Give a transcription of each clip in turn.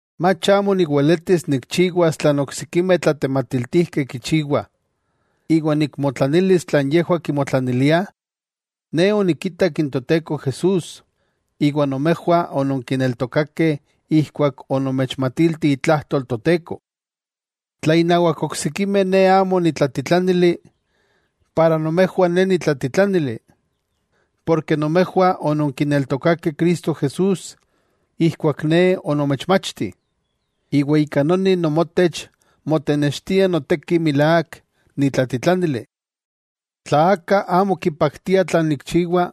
¿Mach amo niweletis nikchiwas tlan oksikimeh tlatematiltijkeh kichiwah, iwa nikmotlanilis tlan yejwah kimotlaniliah? Ne onikitak n Toteko Jesús, iwa nomejwah ononkineltokakeh ijkuak onomechmatilti itlajtol Toteko. Tla innawak oksikimeh ne amo nitlatitlánili, para nomejwah ne nitlatitlánili, porke nomejwah ononkineltokakeh Cristo Jesús ijkuak ne onomechmachti, iwa ika noni nomotech motenextia noteki milák nitlatitlánili. Tla aka amo kipaktia tlan nikchiwa,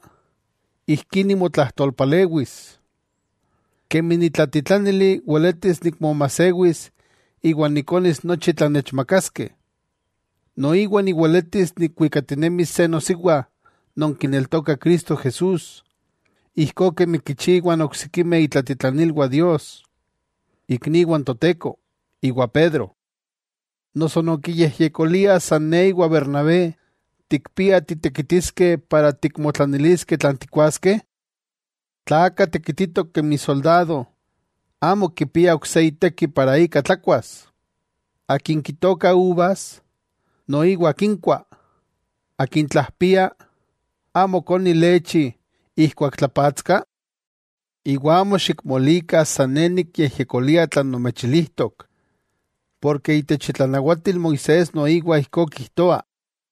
ijkí nimotlajtolpalewis: Kemi nitlatitlánili weletis nikmomajsewis iwa nikonis nochi tlan nechmakaskeh, noiwa niweletis nikwikatinemis se nosiwa non kineltoka Cristo Jesús, ijkó kemi kichiwah n oksikimeh itlatitlanilwah Dios, ikniwah n Toteko, iwa Pedro. ¿Noso nonkiyejyekoliah san ne iwa Bernabé tikpia titekitiskeh para tikmotlaniliskeh tlan tikkuaskeh? Tla aka tekititok kemi soldado, amo kipia ok se iteki para ika tlakuas. Akin kitooka uvas, noiwa kinkua. Akin tlajpia ¿amo koni lechi ijkuak tlapatska? Iwa amo xikmolikah san ne nikyejyekolia tlan nomechilijtok, porke itech itlanawatil Moisés noiwa ijkó kijtoa.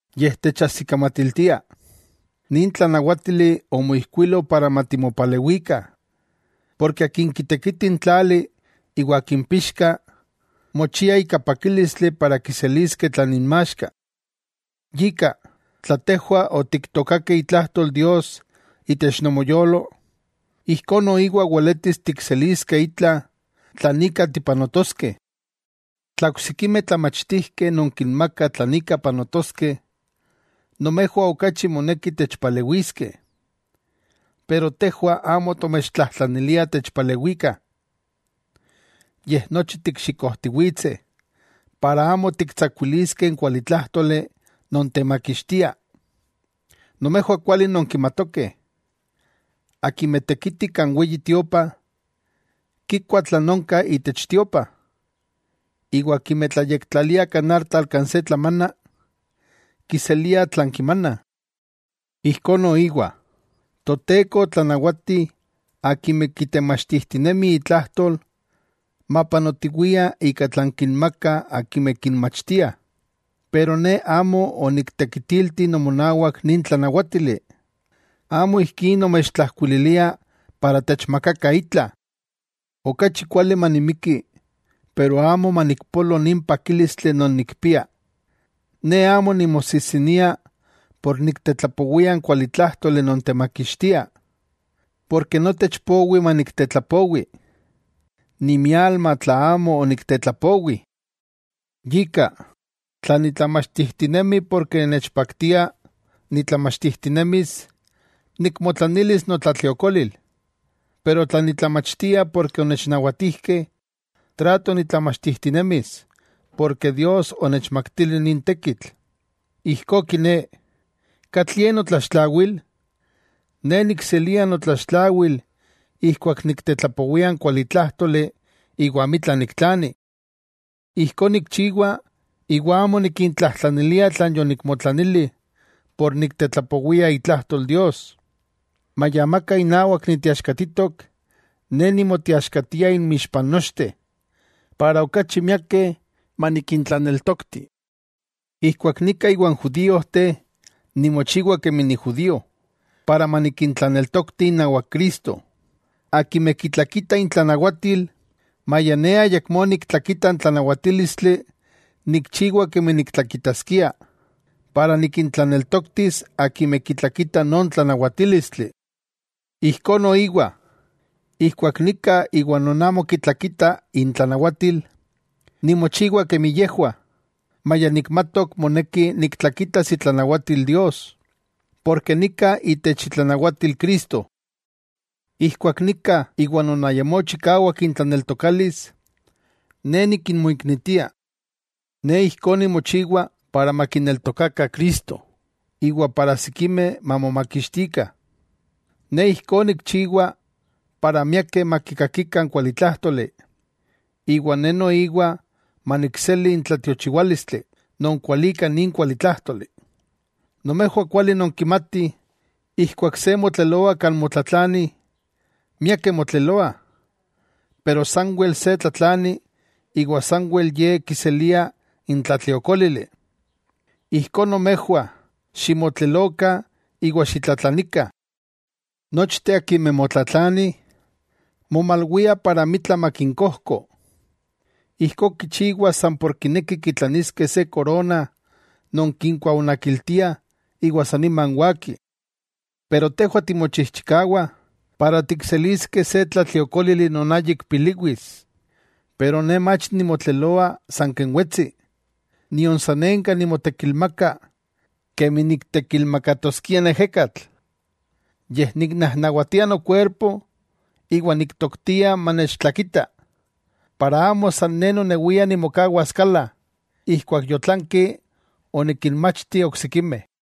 yej techajsikamatiltia. Nin tlanawátili omoijkuilo para matimopalewikah. Porke akin kitekiti n tlali iwa akin pixka, mochiah ika pakílistli para kiseliskeh tlan inmaxka. Yika, tla tejwah otiktookakeh itlajtol Dios itech nomoyolo, ijkó noiwa weletis tikseliskeh itla tlan ika tipanotoskeh. Tla oksikimeh tlamachtijkeh nonkinmakah tlan ika panotoskeh, nomejwah okachi moneki techpalewiskeh. Pero tejwah amo tomechtlajtlaniliah techpalewikah. Yej nochi tikxikojtiwitseh, para amo tiktsakuiliskeh n kualitlájtoli non temakixtia. Nomejwah kuali nonkimatokeh, akimeh tekitih kan Weyi Tiopa, kikuah tlan onka itech tiopa, iwa akimeh tlayektlaliah kan artal kan se tlamana, kiseliah tlan kimanah. Ijkó noiwa, Toteko otlanawati akimeh kitemachtijtinemih itlajtol, mapanotiwiah ika tlan kinmakah akimeh kinmachtiah. Pero ne amo oniktekitilti nomonawak nin tlanawátili, amo ijkí nomechtlajkuililia para techmakakah itla. ¡Okachi kuali manimiki pero amo manikpolo nin pakílistli non nikpia! Ne amo nimosijsinia por niktetlapowia n kualitlájtoli non temakixtia. Porke notech powi maniktetlapowi. ¡Nimialma tla amo oniktetlapowi! Yika, tla nitlamachtijtinemi porke nechpaktia nitlamachtijtinemis, nikmotlanilis notlatliokolil. Pero tla nitlamachtia porke onechnawatijkeh, trato nitlamachtijtinemis, porke Dios onechmaktili nin tekitl. Ijkó kiné, ¿katlie notlaxtlawil? Ne nikselia notlaxtlawil ijkuak niktetlapowia n kualitlájtoli iwa amitla niktlani. Ijkó nikchiwa iwa amo nikintlajtlanilia tlan yonikmotlanili por niktetlapowia itlajtol Dios. Maya amaka inawak niteaxkatitok, ne nimoteaxkatia inmixpa n nochteh, para okachi miakeh manikintlaneltokti. Ijkuak nika iwan judíojteh nimochiwa kemi nijudío, para manikintlaneltokti inawak Cristo, akimeh kitlakitah intlanawatil, maya ne ayakmó niktlakita n tlanawatílistli nikchiwa kemi niktlakitaskia, para nikintlaneltoktis akimeh kitlakitah non tlanawatílistli. Ijkó noiwa, ijkuak nika iwa non amo kitlakitah intlanawatil, nimochiwa kemi yejwah, maya nikmatok moneki niktlakitas itlanawatil Dios, porke nika itech itlanawatil Cristo. Ijkuak nika iwa non ayamó chikawak intlaneltokalis ne nikinmoiknitia, ne ijkó nimochiwa para makineltokakah Cristo iwa para sikimeh mamomakixtikah. Ne ijkó nikchiwa para miakeh makikakikah n kualitlájtoli, iwa ne noiwa manikseli n tlatiochiwálistli, non kualika nin kualitlájtoli. Nomejwah kuali nonkimatih ijkuak se motleloa kan motlatlanih, miakeh motleloah, pero sanwel se tlatlani iwa sanwel ye kiselia n tlatliokólili. Ijkó nomejwah ximotlelokah iwa xitlatlanikah. Nochteh akimeh motlatlanih, momalwiah para amitla makinkojko. Ijkó kichiwah san por kinekih kitlaniskeh se korona non kinkuaonakiltiah iwa sa niman waki. Pero tejwah timochijchikawah para tikseliskeh se tlatliokólili non ayik piliwis. Pero ne mach nimotleloa san ken wetsi, nion sanenka nimotekilmaka kemi niktekilmakatoskia n ejekatl, yej niknajnawatia nokuerpo iwa niktoktia manechtlakita, para amo san ne nonewia nimokawas kala, ijkuak yotlanki onikinmachti oksikimeh.